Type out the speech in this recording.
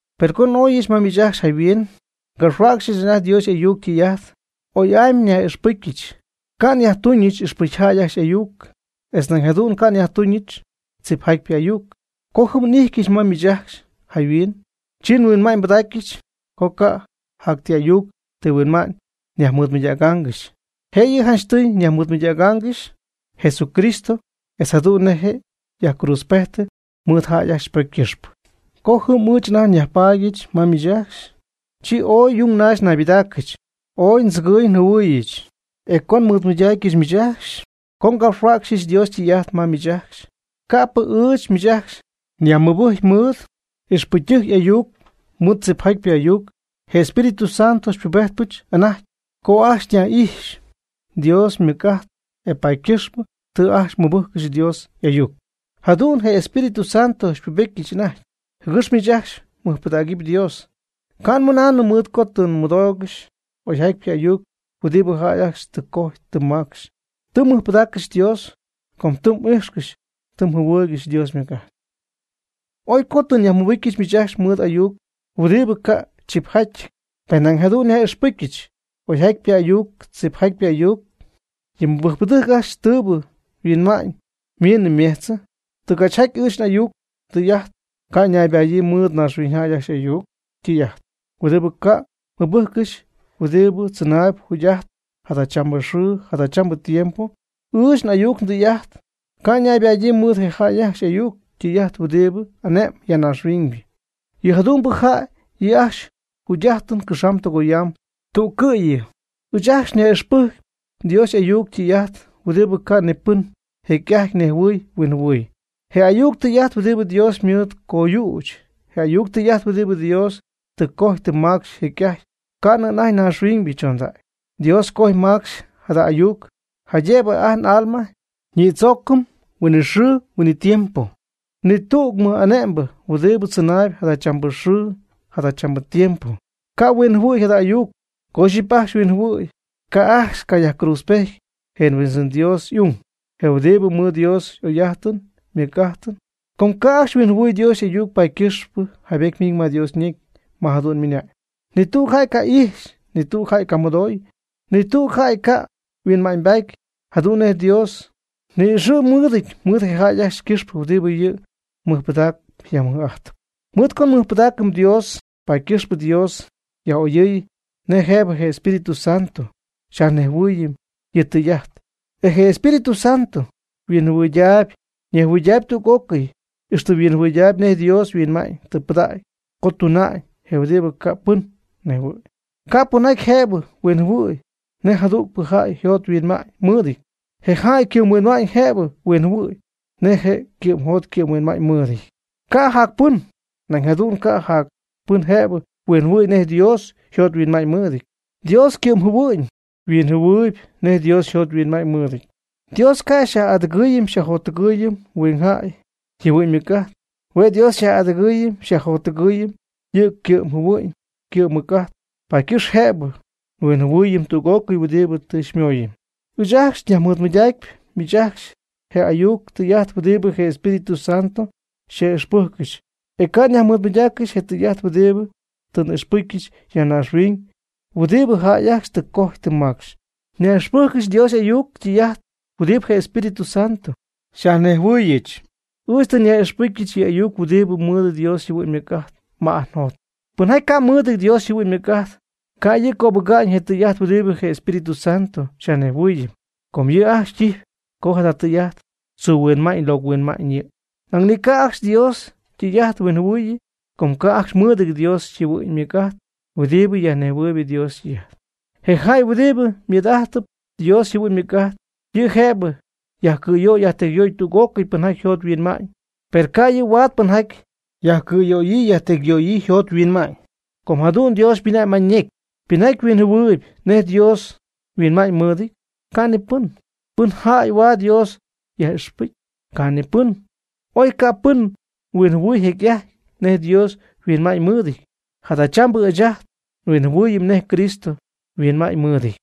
Per co n'oyɨch ma miich ajcxy jayhuin, ngapxhuäcxyɨch anajty Dios y'ayuc ytɨy'ajt, oy'amy nyaj'ixpɨjcyɨch, ca' nyajtuñɨch ixpɨcyjäy ajcxy y'ayuc, etz nañ jadu'n ca' nyajtuñɨch tzipjatypɨ ayuc. Co jɨm n'ijtyɨch ma miich ajcxy jayhuin, chi nhuinma'ñybɨdacyɨch co ca' jac ti ayuc ti huinma'ñ nyajmɨɨdmɨydägaangɨxy, jë'yɨ janchtɨy nyajmɨɨdmɨydägaangɨxy Jesucristo etz jadu'n nej je' yajcruudzpejtɨ mɨɨd jäy ajcxy ypocy ycɨxpɨ. Co jɨm ɨɨch anajty nyajpaadyɨch ma miich ajcxy, chi ooy yung naxy naybɨdaacɨch, ooy ndzɨgɨɨy njɨhuɨɨyɨch. E co nmɨɨdmɨydaacyɨch miich ajcxy, co ngapxhuäcxyɨch Dios ytɨy'ajt ma miich ajcxy, ca'pɨ ɨɨch miich ajcxy nyajmɨbɨcy mɨɨd ixpɨcytɨjc y'ayuc mɨɨd tzipjatypɨ ayuc. Je Espíritu Santo xypubejtpɨch anajty co ajcxy nyaj'ijxy Dios ymɨc'ajt, e paady ycɨxpɨ tɨ ajcxy mmɨbɨjccɨxy Dios y'ayuc. Jadu'n je Espíritu Santo xypubetyɨch anajty, jɨgɨx miich ajcxy mɨjpɨdägɨpy Dios, ca' nmɨnaanɨm mɨɨd co tɨ mmɨdoogɨxy oyjatypɨ ayuc huɨdibɨ jäy ajcxy tɨ cojy tɨ macxy. Tɨ mmɨjpɨdaaccɨxy Dios com tɨ m'ijxcɨxy tɨ mjɨhuɨɨygɨxy Dios ymɨc'ajt. Oy co tɨ nyajmɨbɨcyɨch miich ajcxy mɨɨd ayuc huɨdibɨ ca' chipjatyɨty, per nañ jadu'n nyaj'ixpɨcyɨch oyjatypɨ ayuc tzipjatypɨ ayuc yɨ mɨbɨjcpɨdɨjc ajcxy tɨɨbɨ yhuinma'ñ ymiinnɨ ymejchnɨ. Tɨgachjaty ɨɨch n'ayuc ndɨy'ajt e ca' ñaybadyii mɨɨd naaxhuiñyjäy ajcxy y'ayuc ytɨy'ajt huɨdibɨ ca' mɨbɨjccɨxy huɨdibɨ tzɨnaayb jugy'ajtp jadachambɨ xɨɨ jadachambɨ tiempo. Ɨɨch n'ayuc ndɨy'ajt ca' ñaybadyii mɨɨd je jäy ajcxy y'ayuc ytɨy'ajt huɨdibɨ ane'mb ya naaxhuiñ, yɨ jadu'mbɨ jäy yɨ' ajcxy yjugy'ajtɨn cɨxamb tɨgoyamb tüccɨ́'yɨ. Ɨɨch ajcxy nyaj'ixpɨjcpy Dios y'ayuc ytɨy'ajt huɨdibɨ ca' ni pɨn jecy'ajty nejhuɨy huinjɨhuɨy, je ayuc tɨy'ajt huɨdibɨ Dios ymɨɨd coyüch, je ayuc tɨy'ajt huɨdibɨ Dios tɨ cojy tɨ macxy jecy'ajty ca'nɨ anajty naaxhuiñybɨ chondacy. Dios ycoj ymacx jada ayuc, jaydëbɨ ajt n'alma ñïdzoocɨm huinɨxɨɨ huinɨtiempo. Ni tüg mɨj'ane'mbɨ huɨdibɨ tzɨnaayb jadachambɨ xɨɨ jadachambɨ tiempo, ca' huinjɨhuɨ̈y jada ayuc. Co ixyipy ajcxy huinjɨhuɨ̈y, ca' ajcxy cayajcruudzpejty je Huindzɨn Dios y'ung, je huɨdibɨ mɨɨd Dios y'oy'ajtɨn ymɨj'ajtɨn. Com ca' ajcxy huinjɨhuɨ̈y Dios y'ayuc, paady ycɨxpɨ jaybety ymiñ ma Dios ñecy, ma jadu'n ymɨna'ñ: Ni tüg jäy ca' ixy, ni tüg jäy ca' mɨdoy, ni tüg jäy ca' yhuinma'ñybaady jadu'n nej Dios ni'ixɨ̈y mɨɨdɨty mɨɨd je jäy ajcxy ycɨxpɨ huɨdibɨ yɨ' mɨjpɨdaacɨp yajmɨj'ajtɨp. Mɨɨd co nmɨjpɨdaacɨm Dios, paady ycɨxpɨ Dios yaj'oyɨɨy nej jëbɨ je Espíritu Santo xyajnejhuɨɨyɨm yɨ' ytɨy'ajt. E je Espíritu Santo yhuinjɨhuɨydaayb ñejjɨhuɨydaayb tüg'ócɨy, ixtɨ yhuinjɨhuɨydaayb nej Dios yhuinma'ñ tɨ pɨdägy co tuna'ñ, je huɨdibɨ ca' pɨn nejhuɨ̈y. Ca' pɨnjäy jëbɨ huinjɨhuɨ̈y nej jadügpɨ jäy yjot yhuinma'ñ mɨɨdɨty. Je jäy ycɨ'mhuinma'ñ jëbɨ huinjɨhuɨ̈y nej je' ycɨ'mjot ycɨ'mhuinma'ñ mɨɨdɨty, ca' jac pɨn. Nañ jadu'n ca' jac pɨn jëbɨ huinjɨhuɨ̈y nej Dios yjot yhuinma'ñ mɨɨdɨty. Dios ycɨ'mjɨhuɨ'ñ huinjɨhuɨɨyb nej Dios yjot yhuinma'ñ mɨɨdɨty. Dios ca' xyaj'adɨgɨɨyɨm xyajjottɨgɨɨyɨm huingjäy yjɨhuɨ'ñ ymɨc'ajt. Hue' Dios xyaj'adɨgɨɨyɨm xyajjottɨgɨɨyɨm yɨ' ycɨ'mjɨhuɨ'ñ ycɨ'mmɨc'ajt, paady ycɨxp jëbɨ nhuinjɨhuɨɨyɨm tüg'ócɨy huɨdibɨ tɨ xymooyɨm. Ɨɨch ajcxy nyajmɨɨdmɨydacpy miich ajcxy je ayuc tɨy'ajt huɨdibɨ je Espíritu Santo xyaj'ixpɨ́jccɨxyɨch. E ca' nyajmɨɨdmɨydaaccɨxy je tɨy'ajt huɨdibɨ tɨ n'ixpɨcyɨch ya naaxhuiñ huɨdibɨ jäy ajcxy tɨ cojy tɨ macxy. Nyaj'ixpɨjccɨxy Dios y'ayuc ytɨy'ajt huɨdibɨ je Espíritu Santo xyajnejhuɨɨyɨch. Ɨɨch tɨ nyaj'ixpɨcyɨch yɨ' ajcxy huɨdibɨ mɨɨd Dios yjɨhuɨ'ñ ymɨc'ajt ma y'aa yjot. Pɨnjaty ca' mɨɨdɨty Dios yjɨhuɨ'ñ ymɨc'ajt, ca' yɨ' cöbɨga'ñ je tɨy'ajt huɨdibɨ je Espíritu Santo xyajnejhuɨɨyɨm. Com yɨ' ajcxy ytijp co jada tɨy'ajt tzuu huinma'ñ locɨ huinma'ñ yɨ'. Nañ ni ca' ajcxy Dios ytɨy'ajt huinjɨhuɨɨyɨ, com ca' ajcxy mɨɨdɨty Dios yjɨhuɨ'ñ ymɨc'ajt huɨɨdibɨ yajnejhuɨɨyb Dios ytɨy'ajt. Je jäy huɨdibɨ ymɨɨd'ajtɨpy Dios yjɨhuɨ'ñ ymɨc'ajt, yɨ' jëbɨ yajcɨ̈yöy yajtecyyöy tüg'ócɨy pɨnjaty yjot yhuinma'ñ. Per ca' yɨ' huaad pɨnjaty yajcɨ̈yöyii yajtecyyöyii yjot yhuinma'ñ. Com jadu'n Dios ymɨna'ñ ma ñecy: “¿Pɨn jäy huinjɨhuɨɨyb nej Dios yhuinma'ñymɨɨdɨty? Ca' ni pɨn. ¿Pɨn jäy huaad Dios yaj'ixpɨcy? Ca' ni pɨn.” Oy ca' pɨn huinjɨhuɨ̈y jecy'ajty nej Dios yhuinma'ñymɨɨdɨty, jadachambɨ ɨɨch ajt nhuinjɨhuɨɨyɨm nej Cristo yhuinma'ñymɨɨdɨty.